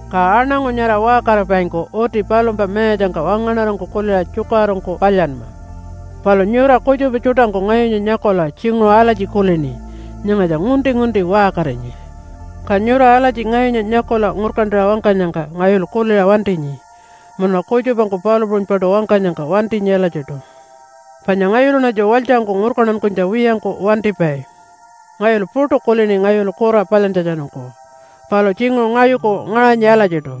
Ka aṉangu nyara waṟkaripaingku uti palumpa mayatjangka wangaṉarangku kuliṟa tjukaṟurungku palyanma. Palu nyura kutjupa tjuṯangku ngayunya nyakula tjinguṟu alatji kulini, “Nyangatja ngunti-ngunti waṟkarinyi.” Ka nyura alatji ngayunya nyakula ngurkantaṟa wangkanyangka ngayulu kuliṟa wantinyi. Munuṉa kutjupangku palu puṟunypaṯu wangkanyangka wantinyi alatjiṯu. Panya ngayuluṉatju walytjangku ngurkantankunytja wiyangku wantipai. Ngayulu puṯu kulini ngayulu kura palyantjatjanungku, palu tjinguṟu ngayuku ngaṟanyi alatjiṯu,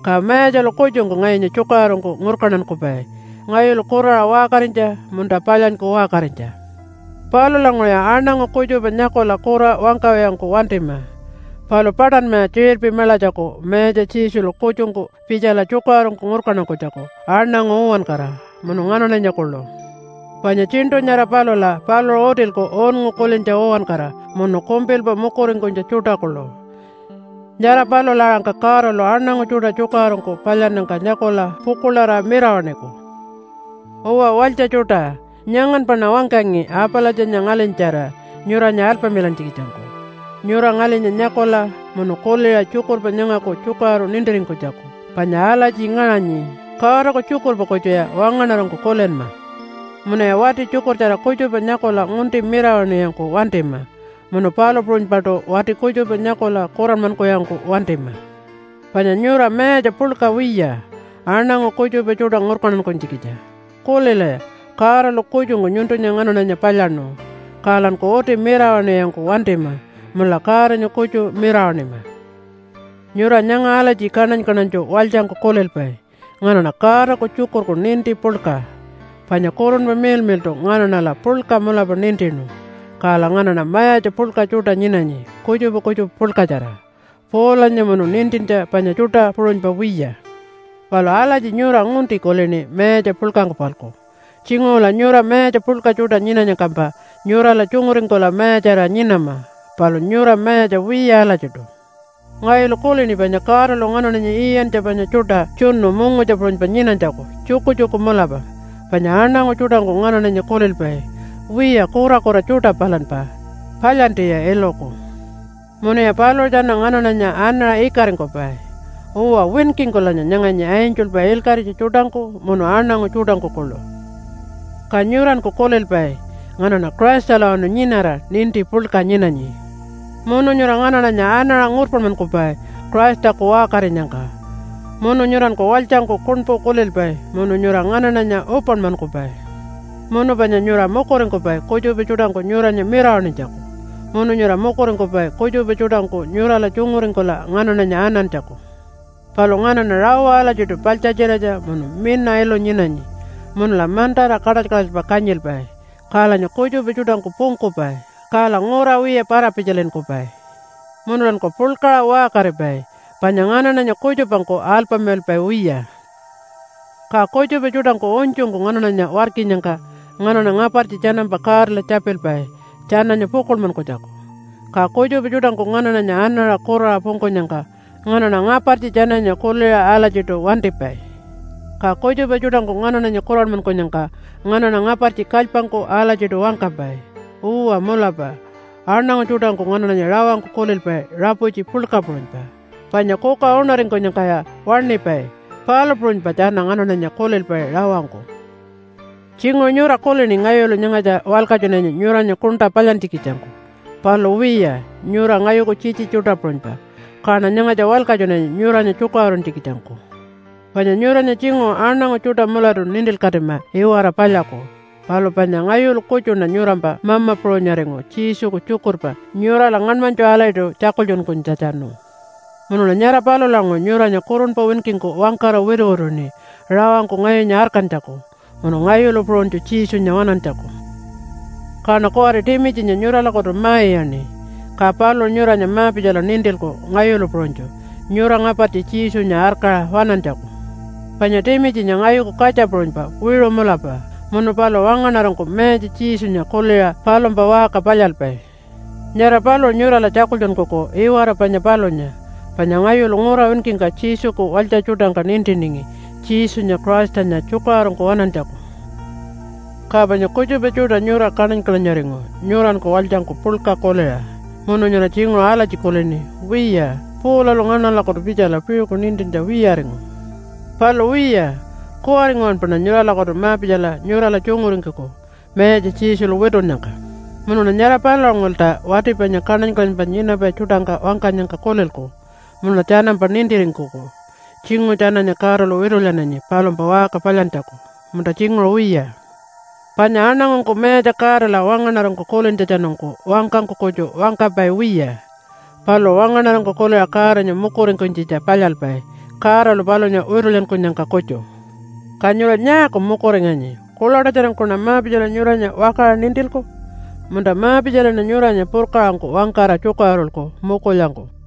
ka Mayatjalu kutjungku ngayunya tjukaṟurungku ngurkantankupai ngayulu kuraṟa waṟkarinytja munta palyanyku waṟkarinytja. Palulanguṟuya aṉangu kutjupa nyakula kura wangkawiyangku wantima, palu paṯanmaya tjiṟirpi maḻatjaku Mayatja Jesulu kutjungku pitjala tjukaṟurungku ngurkantankunytjaku aṉangu uwankara, munu nganaṉanya kuḻu. Panya tjiṉṯu nyara palula paluṟu utilku unngu kulintja uwankara munu kumpilpa mukuringkunytja tjuṯa kuḻu. Nyara palula aṟangka Godalu aṉangu tjuṯa tjukaṟurungku palyannyangka nyakula pukuḻarira mirawaṉiku. Uwa walytja tjuṯa, nyanganpaṉa wangkangi Apalatjanya ngalinyatjara nyuranya alpamilantjikitjangku, nyura ngalinya nyakula munu kuliṟa tjukurpa nyangaku tjukaṟuru nintiringkunytjaku panya alatji ngaṟanyi, “Godaku tjukurpa kutjuya wangaṉarangku kulinma.” Munuya wati tjukurtjara kutjupa nyakula ngunti mirawaṉiwiyangku wantima munu palu puṟunypaṯu wati kutjupa nyakula kuranmankuwiyangku wantima. Panya nyura mayatja puḻka wiya, aṉangu kutjupa tjuṯa ngurkantankunytjikitja. Kulilaya, Godalu kutjungku nyuntunya nganaṉanya palyaṉu, kalanku uti mirawaṉiwiyangku wantima munula Godanya kutju mirawaṉima. Nyura nyanga alatji kaṉany-kaṉanytju walytjangku kulilpai, “Nganaṉa Godaku tjukurku ninti puḻka, panya Kurunpa Miḻmiḻṯu nganaṉala puḻka mulapa nintinu. Kala nganaṉa mayatja puḻka tjuṯa nyinanyi kutjupa kutjupa puḻkatjara, Paulanya munu nintintja panya tjuṯa puṟunypa wiya.” Palu alatji nyura ngunti kulini mayatja puḻkangku-palku. Tjinguṟula nyura mayatja puḻka tjuṯa nyinanyangkampa nyurala tjunguringkula mayatjarira nyinama, palu nyura mayatja wiya alatjiṯu. Ngayulu kulini panya Godalu nganaṉanya iyantja panya tjuṯa tjunu mungutja puṟunypa nyinanytjaku tjukutjuku mulapa. Panya aṉangu tjuṯangku nganaṉanya kulilpai, “Wiya kurakura tjuṯa palanpa. Palyantiya iluku.” Munuya paluṟu tjana nganaṉanya anaṟa ikaringkupai. Uwa, winkingkulanya nyanganyi angelpa ilkaṟitja tjuṯangku munu aṉangu tjuṯangku kuḻu. Ka nyuranku kulilpai, “Nganaṉa Christalawanu nyinara ninti puḻka nyinanyi.” Munu nyura nganaṉanya anaṟa ngurpanmankupai Christaku waṟkarinyangka. Munu nyuranku walytjangku kuṉpu kulilpai munu nyura nganaṉanya upanmankupai. Munu panya nyura mukuringkupai kutjupa tjuṯangku nyuranya mirawaṉinytjaku, munu nyura mukuringkupai kutjupa tjuṯangku nyurala tjunguringkula nganaṉanya anantjaku. Palu nganaṉa rawa alatjiṯu paḻtjatjiratja munu mina ilu nyinanyi. Munula mantara kaṯaly-kaṯalypa kanyilpai. Kalanya kutjupa tjuṯangku pungkupai. Kala ngura wiya para-pitjalinkupai. Munulanku puḻkaṟa waṟkaripai, panya nganaṉanya kutjupangku alpamilalpai wiya. Ka kutjupa tjuṯangku unytjungku nganaṉanya warkinyangka nganaṉa ngapartji tjanampa Godala tjapilpai tjananya pukuḻmankunytjaku. Ka kutjupa tjuṯangku nganaṉanya anaṟa kuraṟa pungkunyangka nganaṉa ngapartji tjananya kuliṟa alatjiṯu wantipai. Ka kutjupa tjuṯangku nganaṉanya kuranmankunyangka nganaṉa ngapartji kalypangku alatjiṯu wangkapai. Uwa mulapa, aṉangu tjuṯangku nganaṉanya rawangku kulilpai raputji puḻka puṟunypa. Panya kuka uṉaringkunyangkaya waṉipai, palu puṟunypa tjana nganaṉanya kulilpai rawangku. Tjinguṟu nyura kulini ngayulu nyangatja walkatjunanyi nyuranya kuṉṯa palyantjikitjangku. Palu wiya, nyura ngayuku tjitji tjuṯa puṟunypa, kaṉa nyangatja walkatjunanyi nyuranya tjukaṟuruntjikitjangku. Panya nyuranya tjinguṟu aṉangu tjuṯa mulatu nintilkatima iwara palyaku, palu panya ngayulu kutjuṉa nyurampa mama puṟunyaringu Jesuku tjukurpa nyurala ngaṉmanytju alatjiṯu tjakultjunkunytjatjanu. Munuṉa nyara palulanguṟu nyuranya kurunpa winkingku wangkara wituwituṉi rawangku ngayunya arkantjaku munu ngayulu puṟunytju Jesunya waṉantjaku. Kaṉa kuwari Timitjinya nyuralakutu ma-iyaṉi, ka paluṟu nyuranya ma-pitjala nintilku ngayulu puṟunytju nyura ngapartji Jesunya arkaṟa waṉantjaku. Panya Timitjinya ngayuku katja puṟunypa wiṟu mulapa, munu paluṟu wangaṉarangku Mayatja Jesunya kuliṟa palumpa waṟka palyalpai. Nyara paluṟu nyurala tjakultjunkuku iwara panya palunya, panya ngayulu ngura winkingka Jesuku walytja tjuṯangka nintiningi Jesunya Christanya tjukaṟurungku waṉantjaku. Ka panya kutjupa tjuṯa nyura kaṉany-kaṉanyaringu nyuranku walytjangku puḻka kuliṟa, munu nyura tjinguṟu alatji kulini, “Wiya, Paulalu nganaṉalakutu pitjala piṟuku nintintja wiyaringu.” Palu wiya, kuwari nguwanpaṉa nyuralakutu ma-pitjala nyurala tjunguringkuku, Mayatja Jesulu witunnyangka. Munuṉa nyara palulanguṟulta wati panya kaṉany-kaṉanypa nyinapai tjuṯangka wangkanyangka kulilku munuṉa tjanampa nintiringkuku tjinguṟu tjananya Godalu witulyananyi palumpa waṟka palyantjaku, munta tjinguṟu wiya. Panya aṉangungku Mayatja Godala wangaṉarangku kulintjatjanungku wangkangku kutju wangkapai wiya. Paluṟu wangaṉarangku kuliṟa Godanya mukuringkunytjitja palyalpai Godalu palunya witulyankunyangka kutju. Ka nyura nyaaku mukuringanyi? Kuḻaṯatjarangkuṉa ma-pitjala nyuranya wakaṟa nintilku? Munta ma-pitjalaṉa nyuranya purkaṟangku wangkara tjukaṟurulku, mukulyangku?